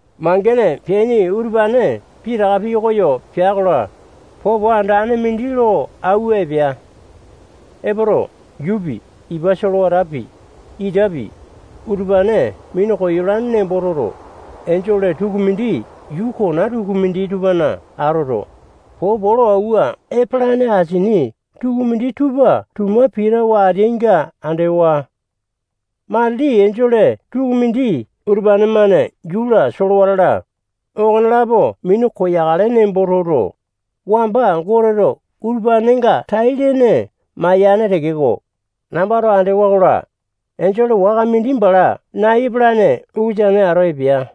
Mangene peaini utupane pitaka pikoyo pea-kola, popo andane mindi lo auwa epea. Epoto, yuupi, ipa solewatapi, itapi, utupane minu koyolane nembo toto, enjole tukumindi yuu kona tukumindi tupana atoto, popo lo auwa epolane asini tukumindi tupa tuma pitawa ateainga andewa. Matili enjole tukumindi utupane-mane yuu-la, solewata-la, okonelapo minu koyakale nembo toto, wamba Goteto utupanenga tai-lene mayane tekeko, nambato andewa-kola, enjole waka mindi bala nai epalane ukusane ato epea.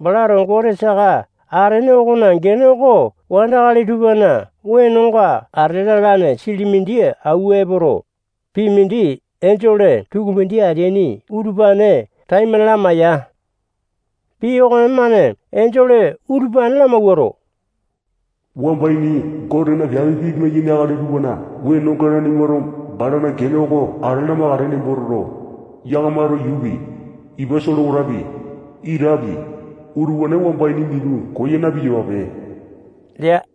Balato Gote saka atene okona gene oko wandakali tupana wenonga ate lalane sili mindi auwa epoto, pii mindi enjole tukumindi ateaini utupane taimane lamaiya. Pii okonemane enjole utupane lamawuato, wamba ini Gotena piape pimai-yaini akali tupana wenonenga nanimato balana gene oko ate lamakale nembo toto, yakamato yuupi, ipa solewatapi, itapi, utupane wamba ini minu koya na-piyapape lea.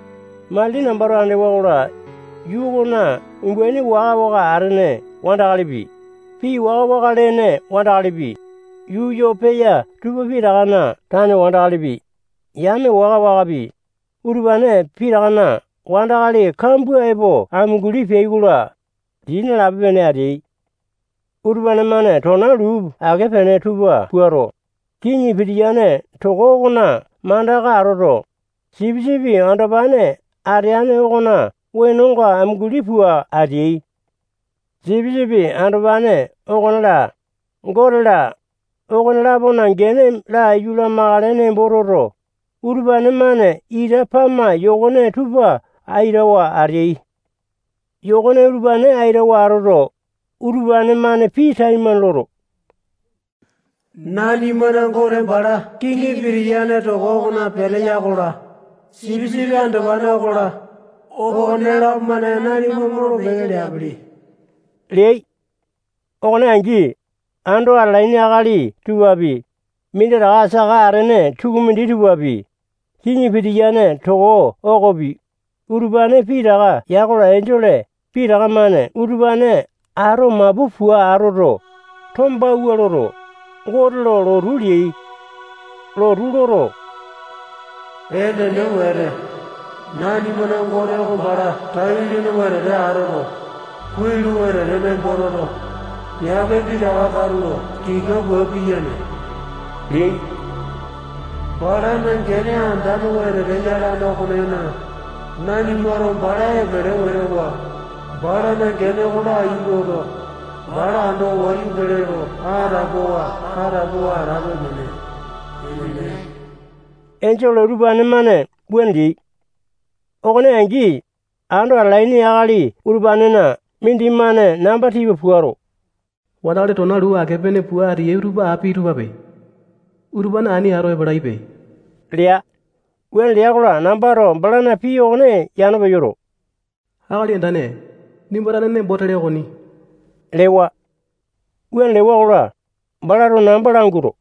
Matili nambato andewa-kola, yuu okona umbaini waka-waka atene wandakalipi, pii waka-waka lene wandakalipi, yuu yo peya tupa pitakana tane wandakalipi, yame waka-wakapi, utupane pitakana wandakali kambua epo amunguli peai-kola, dii nalape-pene ateai. Utupane-mane tona luu ake-pene tupa puato, kiŋi pitiyane toko okona mandaka atoto, Sipisipi Andopane ateane okona wenonga amunguli pua ateai. Sipisipi Andopane okone-la, Gote-la, okone-lapona gene laiyu lamakale nembo toto, utupane-mane ita pama yokone tupa aitawa ateai. Yokone utupane aitawa atoto, utupane-mane pii taimane loto, nanimana Gote bala kiŋi pitiyane toko okona peteya okola, Sipisipi Andopane okola, okonelapo-mane nanima molo-peke leapili leai. Okone angi, ando atalaini akali tupapi, minditaka saka atene tukumindi tupapi, kiŋi pitiyane toko okopi, utupane pitaka ya-kola, enjole pitaka-mane utupane ato mapu pua atoto, tombawua loto, Gote lo lotu leai. Lotu loto, enene wete, nanimana Gote oko bala tai-lene wetete atoto, kuai lo wetete nembo toto, piape pitaka katulo tika pua piyane leai. Balana gene andane wetete yalane okonena, nanimato bala epele wete wa, balana gene oko laiyu loto, bala ando wayu pele lo atapowa-atapowa atape-pene. Enene. Enjole utupane-mane wuane leai. Okone angi, ando atalaini akali utupanena mindimane namba tipa puato, wandakali tona luu ake-pene pua ateyai utupa api tupape. Utupane ani ato epalaipe lea. Wuane lea-kola, nambato balana pii okone yano peyoto, akali andane, nimba tane nembo tele okoni lewa. Wuane lewa-kola, balato namba languato,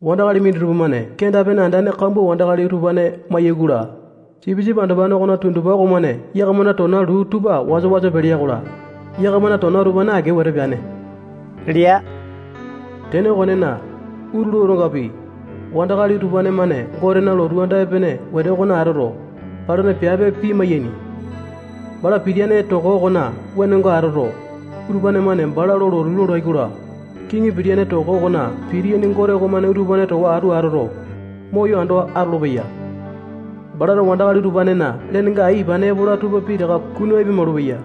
wandakali minditupa-mane kenda-pene andane kambua wandakali utupane mayai-kola, Sipisipi Andopane okona tundupa okomane yakamana tona luu tupa wasa-wasa pelea-kola, yakamana tona utupane ake wete peane lea. Tene okonena, utulu otongapi, wandakali utupane-mane Gotena lotu anda epene wete okona atoto, balana piape pimai-yaini. Bala pitiyane toko okona wenonga atoto, utupane-mane bala lo lotu lolai-kola, kiŋi pitiyane toko okona pitiyane Gote okomane utupane towa atu atoto, moyo ando atolopeya. Balato wandakali utupanena lenenga ai ipane epola tupa pitaka kunu apia-maulupeya.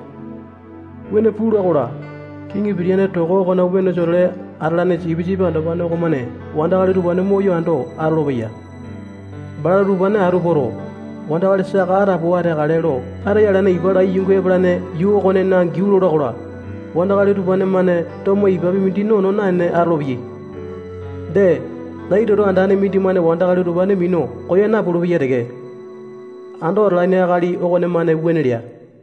Wuane pula-kola, kiŋi pitiyane toko okona wenosa-tole atalane Sipisipi Andopane okomane wandakali utupane moyo ando atolopeya. Balato utupane atu poto, wandakali saka atapowa ateakale lo ataya alane ipa lai yungu epalane yuu okonena giau lola-kola, wandakali utupane-mane tomo ipapi mindi nono naene atolopeyai. Dee, nai toto andane mindimane wandakali utupane minu koya napulu-peya teke. Ando atalane akali okonemane wuane lea.